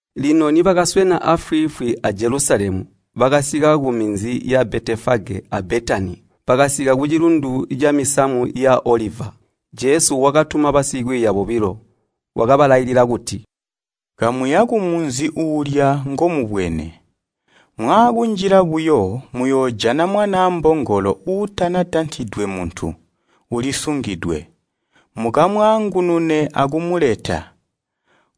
Lino nibakaswena aafwiifwi a Jelusalemu, bakasika kuminzi ya Betefage a Betani, bakasika kucilundu camisamu ya oliva. Jesu wakatuma basikwiiya bobilo. Wakabalailila kuti, “Kamuya kumunzi uulya ngomubwene. Mwaakunjila buyo, muyoojana mwanaa mbongolo uutanatantidwe muntu, ulisungidwe. Mukamwaangunune akumeleta.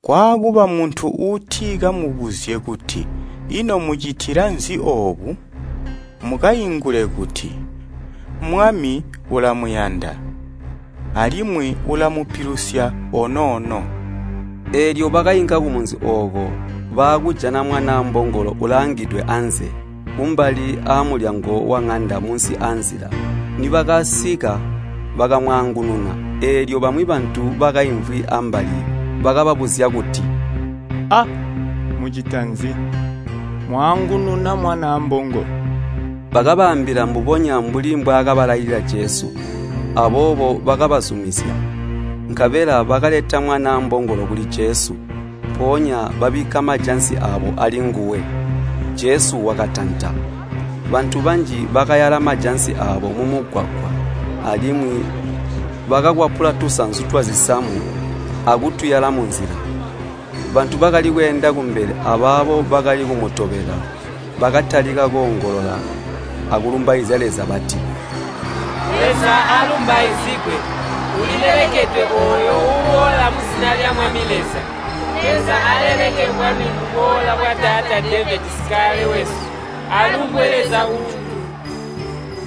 Kwaakuba muntu uuti kamubuzye kuti ‘Ino mucitila nzi oobu?’ Mukaingule kuti, ‘Mwami ulamuyanda, alimwi ulamupilusya onoono.’” Eelyo bakainka kumunzi ooko, baakujana mwanaa mbongolo ulaangidwe anze, kumbali aamulyango waŋanda munsi aanzila. Nibakasika bakamwaangununa. Eelyo bamwi bantu bakaimvwi ambali bakababuzya kuti, “A! Mucita nzi, mwaangununa mwanaa mbongolo?” Bakabaambila mbubonya mbuli mbwaakabalailila Jesu. Aboobo bakabazumizya. Nkabela bakaleta mwanaa mbongolo kuli Jesu, mpoonya babikka majansi aabo alinguwe, Jesu wakatanta. Bantu banji bakayala majansi aabo mumugwagwa, alimwi bakakwapula tusanzu twazisamu akutuyala munzila. Bantu bakali kweenda kumbele abaabo bakali kumutobela, bakatalika koongolola akulumbaizya Leza bati, “Leza aalumbaizigwe! Ulilelekedwe ooyo uuboola muzina lya Mwami Leza. Leza aleleke bwami buboola bwataata Devedi sikale wesu! Alumbwe Leza kujulu!”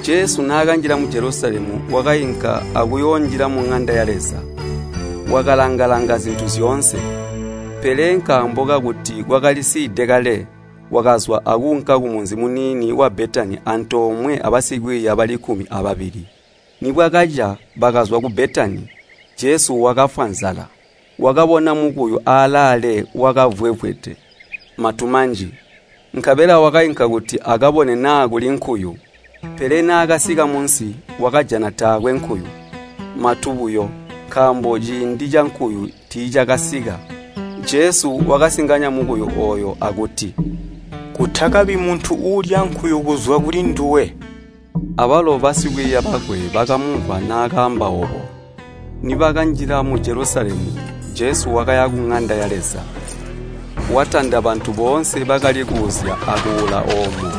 Jesu naakanjila mu Jelusalemu, wakainka akuyoonjila muŋanda ya Leza, wakalanga-langa zintu zyoonse. Pele nkaambo kakuti kwakalisiide kale, wakazwa akuunka kumunzi muniini wa Betani antoomwe abasikwiiya bali kkumi ababili. Nibwakaca, bakazwa ku Betani, Jesu wakafwa nzala. Wakabona mukuyu aalaale wakavwevwede matu manji, nkabela wakainka kuti akabone naa kuli nkuyu. Pele naakasika munsi, wakajana taakwe nkuyu, matu buyo, nkaambo ciindi cankuyu tiicakanasika. Jesu wakasinganya mukuyu ooyo akuti, “Kutakabi muntu uulya nkuyu kuzwa kulinduwe.” Abalo basikwiiya bakwe bakamumvwa naakaamba oobo. Nibakanjila mu Jelusalemu, Jesu wakaya kuŋanda ya Leza, watanda bantu boonse bakali kuuzya akuula oomo,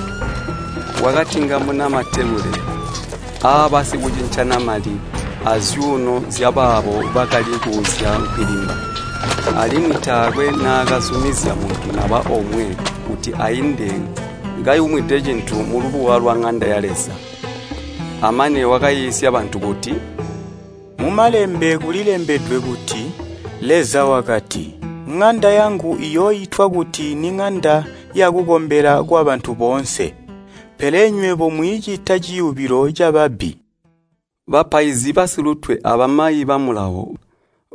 wakatingamuna matebule aabasikucincana mali, azyuuno zyabaabo bakali kuuzya nkwilimba. Alimwi taakwe naakazumizya muntu naba omwe kuti ainde kayumwide cintu mulubuwa lwaŋanda ya Leza. Amane wakaiisya bantu kuti, “Mumalembe kulembedwe kuti Leza wakati, ‘Ŋanda yangu iyooitwa kuti niŋanda yakukombela kwabantu boonse.’ Pele nywebo mwiicita ciyubilo cababbi!” Bapaizi basilutwe abamayi ba Mulawo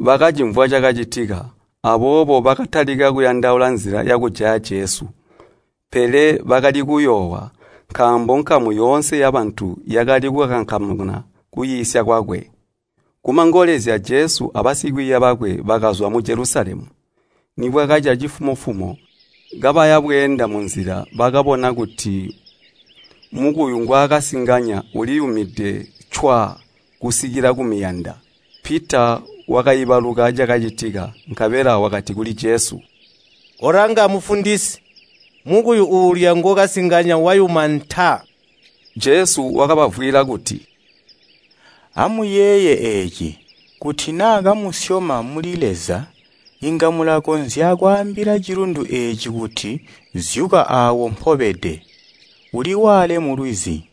bakacimvwa cakacitika, aboobo bakatalika kuyandaula nzila yakujaya Jesu. Pele bakali kuyoowa, nkaambo nkamu yoonse yabantu yakali kukankamana kukwiisya kwakwe. Kumangolezya Jesu abasikwiiya bakwe bakazwa mu Jelusalemu. Nibwakaca cifumo-fumo, kabaya bweenda munzila, bakabona kuti mukuyu ngwaakasinganya uliyumide cwaa kusikila kumiyanda. Pita wakaibaluka cakacitika, nkabela wakati kuli Jesu, “Kolanga Mufundisi, mukuyu uulya ngookasinganya wayuma ntaa!” Jesu wakabavwiila kuti, “Amuyeeye eeci! Kuti naa kamusyoma muli Leza, inga mulakonzya kwaambila cilundu eeci kuti, ‘zyuka awo mpobede, uliwaale mulwizi.’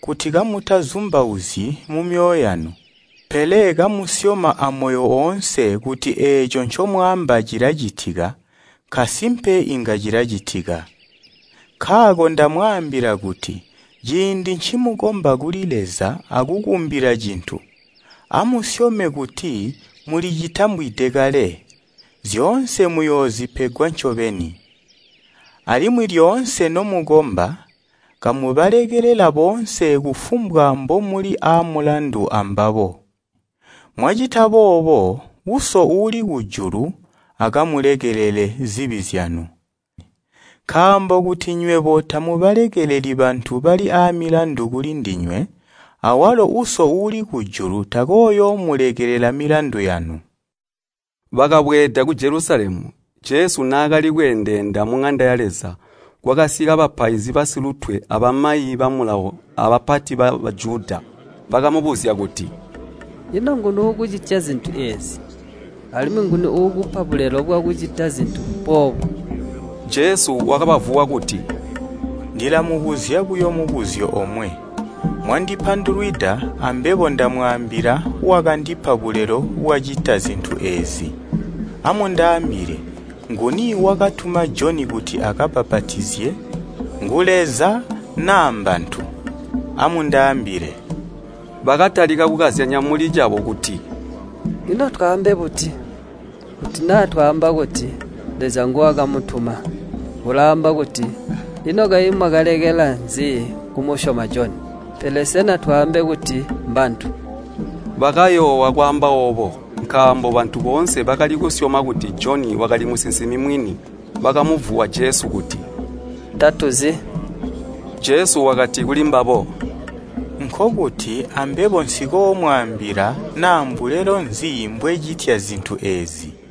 Kuti kamutazumbauzyi mumyoyo yanu, pele kamusyoma amoyo oonse kuti eeco ncomwaamba cilacitika, nkasimpe inga cilacitika. Nkaako ndamwaambila kuti ciindi ncimukomba kuli Leza akukumbila cintu, amusyome kuti mulicitambwide kale, zyoonse muyoozipegwa ncobeni. Alimwi lyoonse nomukomba, kamubalekelela boonse kufumbwa mbomuli aamulandu ambabo, mwacita boobo Uso uuli kujulu akamulekelele zibi zyanu. Nkaambo kuti nywebo tamubalekeleli bantu bali aamilandu kuli ndinywe, awalo Uso uuli kujulu takooyoomulekelela milandu yanu.” Bakabweeda ku Jelusalemu. Jesu naakali kweendeenda muŋanda ya Leza, kwakasika bapaizi basilutwe abamayi ba Mulawo abapati ba Bajuda, bakamubuzya kuti, “Ino nguni uukucitya zintu eezi? Alimwi nguni uukupa bulelo bwakucita zintu boobu?” Jesu wakabavuwa kuti, “Ndilamubuzya buyo mubuzyo omwe. Mwandipandulwida, ambebo ndamwaambila wakandipa bulelo bwacita zintu eezi. Amundaambile, nguni wakatuma Joni kuti abbapatizye, ngu Leza naa mbantu? Amundaambile!” Bakatalika kukazyanya muli cabo kuti, “Ino twaambe buti? Kuti naa twaamba kuti, ‘Leza nguwakumutuma’ ulaamba kuti, ‘Ino kayi mwakalekela nzi kumusyoma Joni?’ Pele sena twaambe kuti, ‘Mbantu?’” Bakayoowa kwaamba oobo, nkaambo bantu boonse bakali kusyoma kuti Joni wakali musinsimi mwini. Bakamuvuwa Jesu kuti, “Tatuzi.” Jesu wakati kuli mbabo, “Nkokuti, ambebo nsikoomwaambila naa mbulelo nzi mbwecitya zintu eezi.”